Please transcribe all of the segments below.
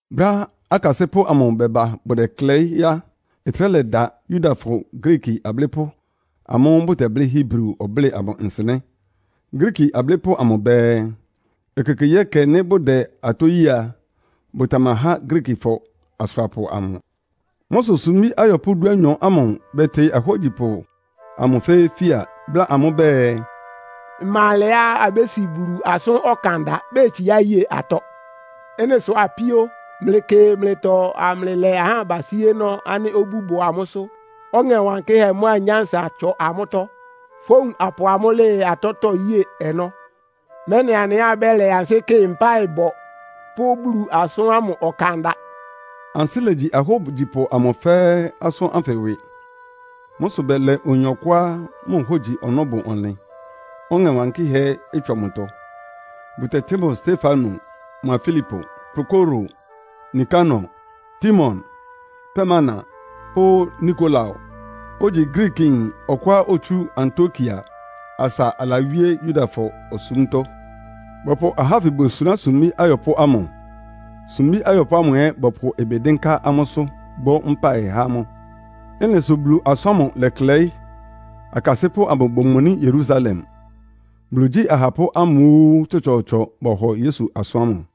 Brɛ́á akasɩ́pʋ́ amʋ bɛba bʋdɛklɛɩ́ á, ɩtrɛ́ lɛda Yudafɔ Griiki ablɩ́pʋ́ amʋ́ʋ́ bʋtɛblɩ́ Hebri ɔblɩ́ɩ amʋ nsɩnɛ́. Griiki ablɩ́pʋ́ amʋ bɛɛ, ekekegyíɛkɛ, nɩ́ bʋdɛ atɔ́ yée a, bʋtamahá Griikifɔ asʋrapʋ amʋ. Mʋ́ sʋ sumbí ayɔpʋ́ dúanyɔ ámʋ bɛtɩ ahógyipʋ amʋ fɛ́ɛ́ fia, bláa amʋ́ bɛɛ, “Ɩma alɛá abési Bulu asʋ́n ɔkanda betsiá ye atɔ́. Ɩ́nɩ sʋ apíó, mlɩkɩ mlɩtɔ amlɩlɛ ahá abasíénɔ́ ánɩ́ obú bʋ amʋ́sʋ́, Ɔŋɛ Wankɩ́hɛ́ mʋ́a nyánsa ɩtsɔ amʋ́tɔ́. Fówun apʋ amʋ́ lɩɩ atɔ́tɔ́ yée ɔnɔ́, mɛ́nɩ anɩ ɛ́ abɛ́lɛ ansɩ́ kɩ mpáɩbɔ pʋ́ Bulu asʋ́n ámʋ ɔkanda.” Ansɩ́ legyi ahógyipʋ amʋ fɛ́ɛ́ asʋ́n ánfɩ ɩwɩ. Mʋ́ sʋ bɛlɛ oyin ɔkʋá mʋ hógyi ɔnɔ́ bʋ ɔnlɩn, Ɔŋɛ Wankɩ́hɛ́ ɛ́ ɩtsɔ mʋtɔ, bʋtɛtɩ́ mʋ Stefano mʋa Filipo, Prokoro, Nikanor, Timon, Parmena pʋ́ Nikolao, ogyi Griikiyin ɔkʋá otsú Antiokia asa alawíé Yudafɔ osúmtɔ́. Bɔpʋ ahá ánfɩ bosuná sumbí ayɔpʋ́ ámʋ, sumbí ayɔpʋ́ ámʋ ɛ́ bɔpʋ ɩbɩ dɩ́nká amʋ́sʋ́, bɔ́ mpáɩ há amʋ́. Ɩ́nɩ sʋ Bulu asʋ́n ámʋ lɛklɛɩ́, akasɩ́pʋ́ amʋ bomoní Yerusalem. Bulu igyí ahapʋ́ ámʋ óó tsɔtsɔɔtsɔ bɔhɔ Yesu asʋ́n ámʋ.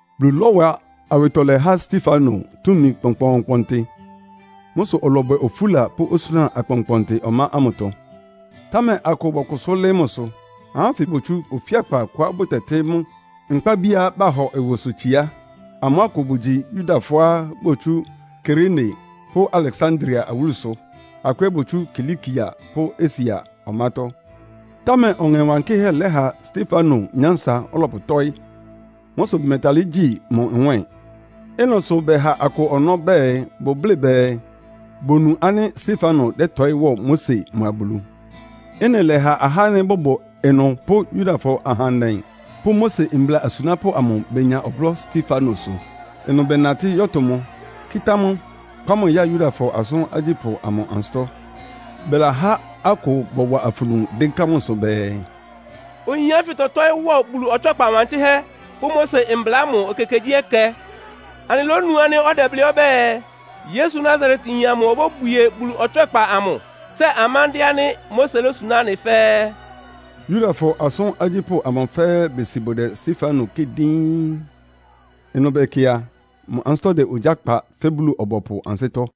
Bulu lɔ́wa awɩtɔlɛ há Stefano túmi kpɔnkpɔɔnkpɔntɩ. Mʋ́ sʋ ɔlɔbwɛ ofúla pʋ́ osúna akpɔnkpɔntɩ ɔmá ámʋtɔ. Támɛ akʋ bɔkʋsʋ́ lɩ́ɩ́ mʋsʋ. Ahá ánfɩ botsú ofíakpa kʋá bʋtɛtɩ́ mʋ́ “Nkpábiá Bahɔ Ɩwɩsʋtsiá.” Amʋ́ akʋ bʋgyi Yudafɔá botsú Kirene pʋ́ Aleksandria awúlusʋ. Akʋ ɛ́ botsú Kilikia pʋ́ Asia ɔmátɔ́. Támɛ Ɔŋɛ Wankɩ́hɛ́ lɛ́ha Stefano nyánsa ɔlɔpʋtɔ́ɩ́. Mʋ́ sʋ bʋmɛtalɩ́ gyí mʋ nwɛ́ɛn. Ɩ́nɩ sʋ bɛha akʋ ɔnɔ́ bɛɛ bʋblɩ́ bɛɛ, bonu ánɩ́ Stefano dɛ́tɔɩ́ wɔ Mose mʋa Bulu. Ɩ́nɩ lɛ́ha ahá ánɩ́ bʋbʋ ɩnʋ pʋ́ Yudafɔ ahandɛ pʋ́ Mose mbla asunápʋ́ amʋ benya ɔblɔ́ Stefanosʋ. Ɩnʋ bɛnatɩ́ yɔ́tʋ mʋ, kɩ́tá mʋ, kpá mʋ ya Yudafɔ Asʋ́n Agyípʋ́ amʋ ansɩ́tɔ́. Bɛlahá akʋ bɔwa afunu dɩ́nká mʋsʋ bɛɛ, “Oyin ánfɩ tɔtɔ́ɩ́ wɔ Bulu ɔtswɛ́kpa wankɩ́hɛ́ pʋ́ Mose mbla ámʋ ekekegyíɛkɛ. Anɩlónu ánɩ́ ɔdɛblɩ́ ɔbɛ́ɛ, ‘Yesu Nasaretyin amʋ obóbwie Bulu ɔtswɛ́kpa amʋ, tsɛ amándɩ́ɛ́ ánɩ́ Mose lósuná anɩ fɛ́ɛ́.’” Yudafɔ Asʋ́n Agyípʋ́ amʋ fɛ́ɛ́ besi bʋdɛ Stefano kɩ́ɩ díín. Ɩnʋ bɛkɩ a, mʋ ansɩ́tɔ́ dɛ ogyá kpa fɛ́ Bulu-ɔbɔpʋ ansɩ́tɔ́.